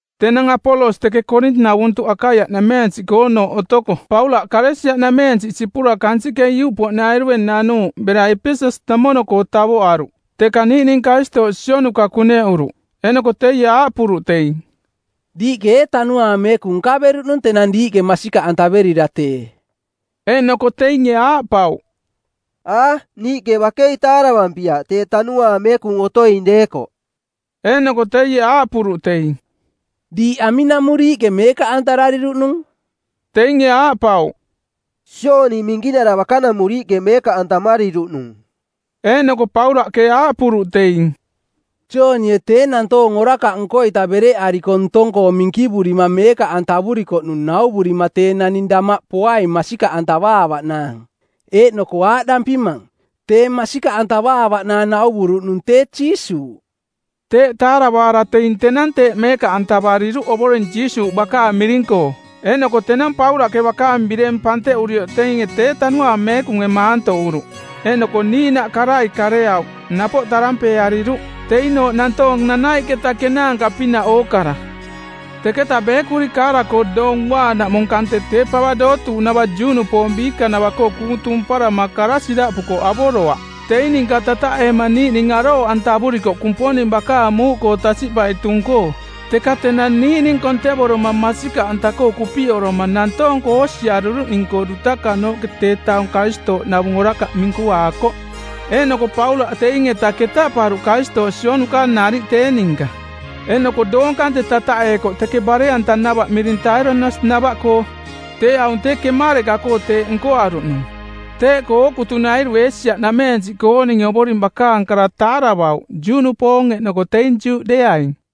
Tenang Apolos teke Koorin-navuntuꞌ Akaiaꞌnameensiꞌkoonooꞌ otoko Paulaꞌ Kalesia-nameensiꞌ sipura kansiꞌke iuꞌpoꞌnairue nanuuꞌ bera Epeses-namono-koo tavoꞌaruꞌ. Teka niiꞌning Karistooꞌ sionuka kuneꞌuruꞌ. Eeꞌnoko teie aaꞌpuruꞌ teing, “Diiꞌke ee Tanuaang Meekung nkaveruꞌnung tenang diiꞌke masikaꞌantaverira tee?” Eeꞌnoko teinge aaꞌpauꞌ, “A, niiꞌke bakei taaravampiaꞌ tee Tanuaang Meekung otoing deekoꞌ.” Eeꞌnoko teie aaꞌpuruꞌ teing, “Diiꞌ aminamuriiꞌke meekaꞌantarariruꞌnung?” Teinge aaꞌpauꞌ, “Jooni Minkinara bakanamuriiꞌke meekaꞌantamariruꞌnung.” Eeꞌnoko Paulaꞌke aaꞌpuruꞌ teing, “Joonie tee nantoong orakaꞌ nko-ita bereꞌariko ntong-koo minkivurima meekaꞌantavurikoꞌnung nauvurima tee naning damaꞌ poaing masikaꞌantavaavaꞌnaang, eeꞌnoko aaꞌdampimang, tee masikaꞌantavaavaꞌnaang nauvuruꞌnung tee Jiisuuꞌ.” Teeꞌ taaravaara teing tenang teeꞌ meekaꞌantavariruꞌ Ovoring Jiisuuꞌ bakaang miring-koo. Eeꞌnoko tenang Paulaꞌke bakaang bireng panteꞌurioꞌ teing tee Tanuaang Meekunge maantoꞌuruꞌ, eeꞌnoko niiꞌnaꞌ karai kareauꞌ, napoꞌ tarampeeariruꞌ. Teinooꞌ nantoong nanaiꞌketa kenaanka-pinaꞌ ookara. Teketa beekuri kaara-koo Doong Uaanaꞌmung kante tee pava dootuuꞌnava Juꞌnupoong biikanava-koo kuung tumparama kara siraꞌpukoꞌ avoroaꞌ. Teing ninka tataꞌeema niiꞌning arooꞌantavurikoꞌ Kumponing bakaang muuꞌkoo tasiꞌpai tung-koo. Teka tenang niiꞌning kontevoroma, masikaꞌanta-koo kupiꞌoroma, nantoong-koo oosiariruꞌning-koo dutakanooꞌke tee taung Karistooꞌnavung orakaꞌ minkuaakoꞌ. Eeꞌnoko Paulaꞌ teing-eta ketaꞌparuꞌ Karistooꞌ sionuka nariꞌ tee ninka. Eeꞌnoko doong kante tataꞌeekoꞌ teke bare-antanava miring Tairanus-nava-koo. Tee aung tee kemareꞌka-koo teeꞌ nkoaruꞌnung. Teeꞌkoo ookutunairue Eesia-nameensiꞌkooninge Ovoring bakaang kara taaravauꞌ, Juꞌnupoong eeꞌnoko teing Juꞌdeeaing.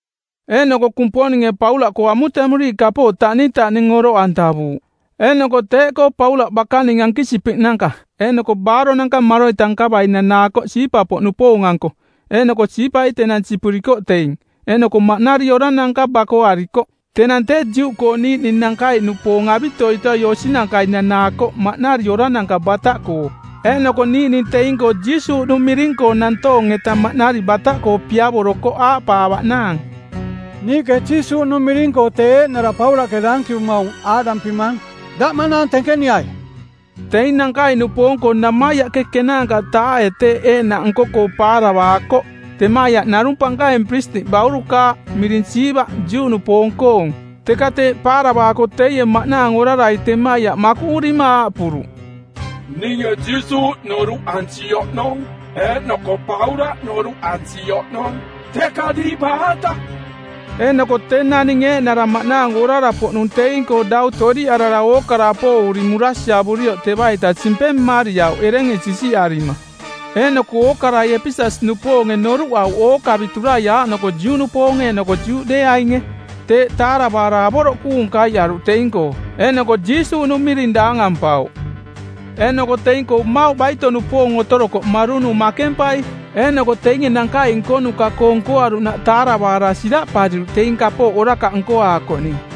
Eeꞌnoko Kumponinge Paulaꞌkoo amutemuriiꞌ kapooꞌ taꞌnintaꞌning oroꞌantavuuꞌ. Eeꞌnoko teeꞌkoo Paulaꞌ bakaning ankisipiꞌnanka eeꞌnoko baaronanka maroita nkavai nanaakoꞌ siipa-poꞌnupoong-anko, eeꞌnoko siipai tenang sipurikoꞌ teing, eeꞌnoko maꞌnari orananka bakoarikoꞌ. Tenang tee Juꞌkoo niiꞌning nankaiꞌnupoong avitoitoi osinankai nanaakoꞌ maꞌnari orananka bataꞌkoo, eeꞌnoko niiꞌning teing-koo Jiisuuꞌnung miring-koo nantoong-eta maꞌnari bataꞌkoo piavorokoꞌ aaꞌpaavaꞌnaang, “Niiꞌke Jiisuuꞌnung miring-koo, tee eeꞌnara Paulaꞌke daankivumaung, aaꞌdampimang: Daꞌ maꞌnaang tenkeniai.” Teing nankaiꞌnupoong-koo namaiaꞌke ˜kenaanka-taae teeꞌ eeꞌnaꞌ nko-koo paaravaakoꞌ. Temaiaꞌ narung pankaing piristiꞌ baurukaaꞌ miring Siiva, Juꞌnupoong-koong. Teka teeꞌ paaravaako teie maꞌnaang orarai temaiaꞌ makuꞌurima aaꞌpuruꞌ, “Ninge Jiisuuꞌ noruꞌansi oꞌnong eeꞌnoko Paulaꞌ noruꞌansi oꞌnong, teka diiꞌ baata?” Eeꞌnoko tee naning eeꞌnara maꞌnaang orara-poꞌnung teing-koo dau toꞌdiꞌarara ookara apooꞌuri murasiavurioꞌ teva-ita simpeng mmariauꞌ erenge sisiꞌarima. Eeꞌnoko ookarai Epeses-nupoonge noruꞌauꞌ ookaviturai aaꞌnoko Juꞌnupoonge eeꞌnoko Juꞌdeeainge. Teeꞌ taaravaara avoroꞌ kuung kaiꞌaruꞌ teing-koo, eeꞌnoko Jiisuuꞌnung miring daangampauꞌ. Eeꞌnoko teing-koo mmauꞌ baito-nupoong otorokoꞌ marunu makempai. Eeꞌnoko teinge nankaiꞌ nkonuka-koo nkoaruꞌnaꞌ taaravaara siraꞌpariruꞌ teing kapooꞌ orakaꞌ nkoaakoꞌning.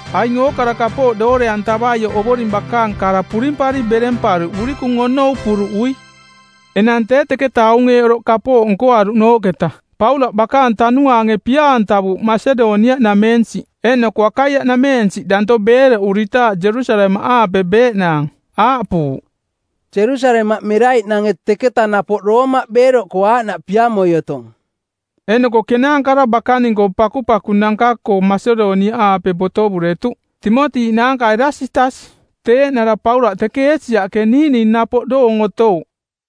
Aing ookara kapooꞌ doore-antavaioꞌ Ovoring bakaang kara purimpari beremparuꞌ urikung onou puruꞌui. Enang tee teketa aung eeꞌ oroꞌ kapooꞌ nkoaruꞌnooꞌketa, Paulaꞌ bakaang tanuaange pia-antavuuꞌ Masedoniaꞌnameensiꞌ eeꞌnoko Akaiaꞌnameensiꞌ danto beeroꞌuritaaꞌ Jerusalemaꞌaape beeꞌnaang. Aaꞌpuuꞌ, “Jerusalemaꞌ meraiꞌnange teketa napoꞌ Roomaꞌ beeroꞌkoo aaꞌnaꞌ piamoi otong.” Eeꞌnoko kenaankara bakaning-koo pakupakunanka-koo Masedoniaꞌaape botovuretuꞌ, Timoti naanka Erasitas. Tee eeꞌnara Paulaꞌ teke Eesiaꞌke niiꞌning napoꞌ doong otouꞌ.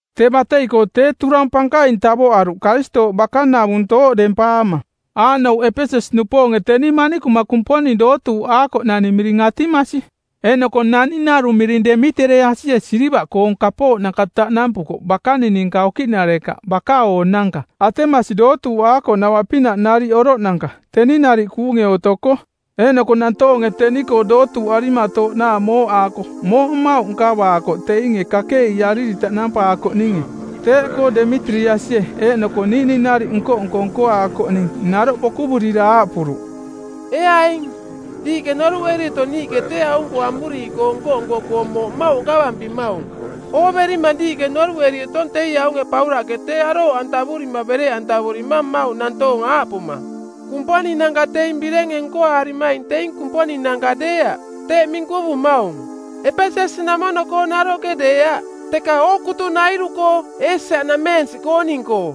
Tee batei-koo tee turang pankaing tavoꞌaruꞌ Karistooꞌ bakanavung tooꞌdempaama. Aaꞌnouꞌ: Epeses-nupoonge teni manikuma kumponing dootuuꞌaakoꞌnani miring Atimasi, eeꞌnoko naning narung miring Demitereasie silivaꞌkoong kapooꞌnanka taꞌnampukoꞌ bakaning ninka okiꞌnarekaꞌ baka-oonanka Atemasi dootuuꞌaakoꞌnava-pinaꞌ nariꞌ oroꞌnanka teni nariꞌ kuunge otoko. Eeꞌnoko nantoonge teni-koo dootuuꞌarimatooꞌnaang mooꞌaako mooꞌ mmauꞌ nkavaakoꞌ teinge kakeꞌiiariri taꞌnampaakoꞌninge. Teeꞌkoo Demitereasie eeꞌnoko niiꞌning nariꞌ nko-nko nkoaakoꞌning naroꞌ bokuvurira aaꞌpuruꞌ, “Ee aing, diiꞌke noruꞌeri otong niiꞌke tee aung-koo amuriiꞌkoo nko-nko-koo mooꞌ mmauꞌ nkavampimaung. Ooverimang diiꞌke noruꞌeri otong teie aunge Paulaꞌke tee arooꞌantavurima bereꞌantavurimang mmauꞌ nantoong aaꞌpuma, ‘Kumponinanka teing birenge nkoaarimaing teing kumponinanka deeaꞌ.’ Teeꞌ minkuvumaung, Epeses-namono-koo naroꞌke deeaꞌ, teka ookutunairu-koo Eesia-nameensiꞌkooning-koo.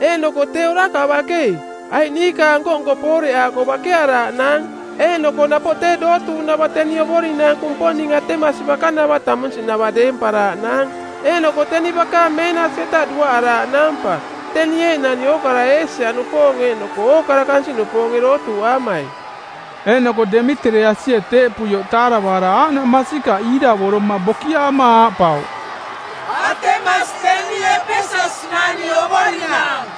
Eeꞌnoko tee orakaꞌ bakei, aiꞌ niikaang nko-nko pooreꞌaako bakearaaꞌnaang eeꞌnoko napoꞌ tee dootuuꞌnava teni ovorinaang kumponing Atemasi bakanava tamunsiꞌnava deemparaaꞌnaang eeꞌnoko teni bakaang meenasi-eta duaꞌaraaꞌnaang pa, teni eeꞌnani ookara Eesia-nupoong eeꞌnoko ookara kansiꞌnupoonge dootuuꞌaamai.” Eeꞌnoko Demitereasie teeꞌpuioꞌ taaravaara aaꞌnaꞌ masikaꞌ iiravoroma bokiaama aaꞌpauꞌ, “Atemasi teni Epeses-nani ovorinaang.”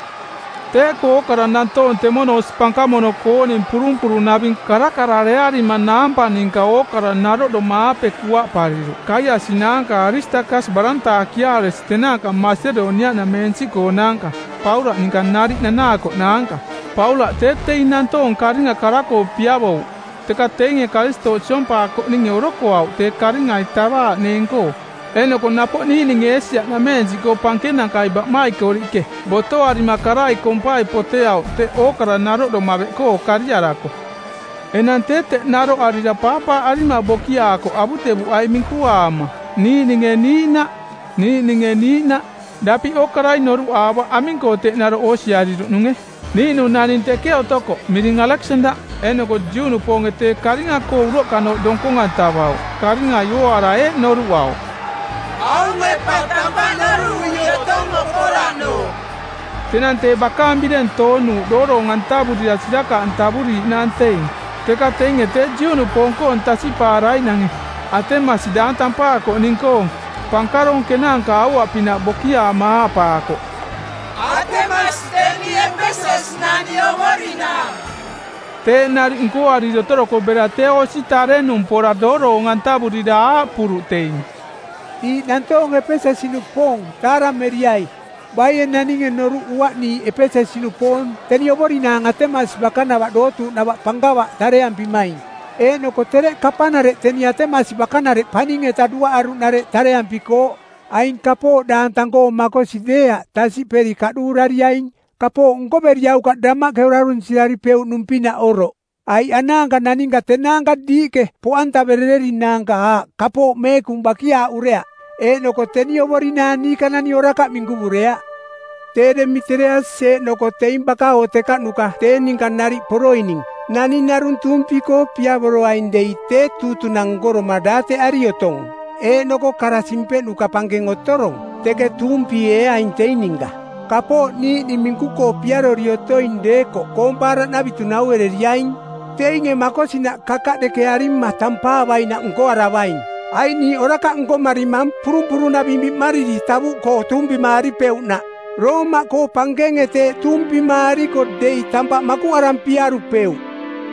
Teeꞌkoo ookara nantoong temono osi pankamono-kooning purumpurunaving karakararearima naampa ninka ookara naroꞌdoma-aape kuaꞌpariruꞌ Kaiasi naanka Aristakas barantaakiaaresi tenaanka Masedoniaꞌnameensiꞌkoonaanka Paulaꞌ ninka nariꞌ nanaakoꞌnaanka. Paulaꞌ tee teing nantoong karinga kara-koo piavouꞌ, teka teinge Karistooꞌ siompaakoꞌninge orokoauꞌ tee karingai tavaaꞌneeng-koo. Eeꞌnoko napoꞌ niiꞌninge Eesia-nameensiꞌkoo pankenankai baꞌmaikoriꞌke botoarima karai kompai poteauꞌ teꞌ ookara naroꞌdoma beꞌkoo kariarako. Enang tee teꞌ naroꞌarira paapaaꞌarima bokiaakoꞌ avutevuꞌai minkuaama niiꞌninge niiꞌnaꞌ, niiꞌninge niiꞌnaꞌ. Daping ookarai noruꞌaavaꞌ aming-koo teꞌ naroꞌ oosiariruꞌnunge. Niiꞌnung naning teke otokoꞌ miring Aleksandaꞌ, eeꞌnoko Juꞌnupoonge tee karinga-koo uroꞌkanooꞌ donkong-antavauꞌ. Karingai ooaara eeꞌ noruꞌauꞌ, “Aunge pa tampaꞌ noruꞌui otong okoraꞌnooꞌ.” Tenang tee bakaang bireng toonuuꞌ dooroong-antavurira sirakaꞌantavuriiꞌnaang teing. Teka teinge tee Juꞌnupoong-koong tasiꞌpaaraiꞌnange, Atemasi daang tampaakoꞌning-koong, pankaroong kenaanka aua-pinaꞌ bokiaama aaꞌpaakoꞌ, “Atemasi teni Epeses-nani ovorinaang.” Teeꞌ nariꞌ nkoariri otorokoꞌ bera tee osi tarenung pora dooroong-antavurira aaꞌpuruꞌ teing, “Diiꞌ nantoong Epeses-nupoong taarameriai. Baie naninge noruꞌuaꞌ niiꞌ Epeses-nupoong teni ovorinaang Atemasi bakanava dootuuꞌnava pankava tareampimaing eeꞌnoko tereꞌ kapanareꞌ teni Atemasi bakanareꞌ paning-eta duaꞌaruꞌnareꞌ tareampikooꞌ. Aing kapooꞌ daang tang-koo makosi deeaꞌ tasiꞌperi kaꞌduurariaing, kapooꞌ nkoveriaukaꞌ damaꞌke orarunsiraripeuꞌnung-pinaꞌ oroꞌ. Aiꞌ anaanka naninka tenaanka diiꞌke poꞌantaverererinaanka aꞌ kapooꞌ meekung bakiaaꞌureaꞌ eeꞌnoko teni ovorinaang niikanani orakaꞌ minkuvureaꞌ. Tee Demitereasi eeꞌnoko teing baka-oo tekaꞌnuka tee ninka nariꞌ poroining naning narung tuumpi-koo piavoroaing dei tee tuutunang˜ nkoroma daateꞌari otong eeꞌnoko kara simpeꞌnuka˜ pankeng otorong, teke tuumpieeaing teing ninka. Kapooꞌ niiꞌning minku-koo piarori otoing deekoꞌ koompaaraꞌnavitu nauereriaing. Teinge makosinaꞌ kakaꞌdekearima tampaavainaꞌ nkoaravaing. Aiꞌ niiꞌ orakaꞌ nkomarimang purumpurunaving biꞌmariri tavuꞌkoo tuumpimaaripeuꞌnaꞌ. Roomaꞌkoo pankenge teeꞌ tuumpimaariko dei tampaꞌ makuꞌarampiarupeuꞌ.”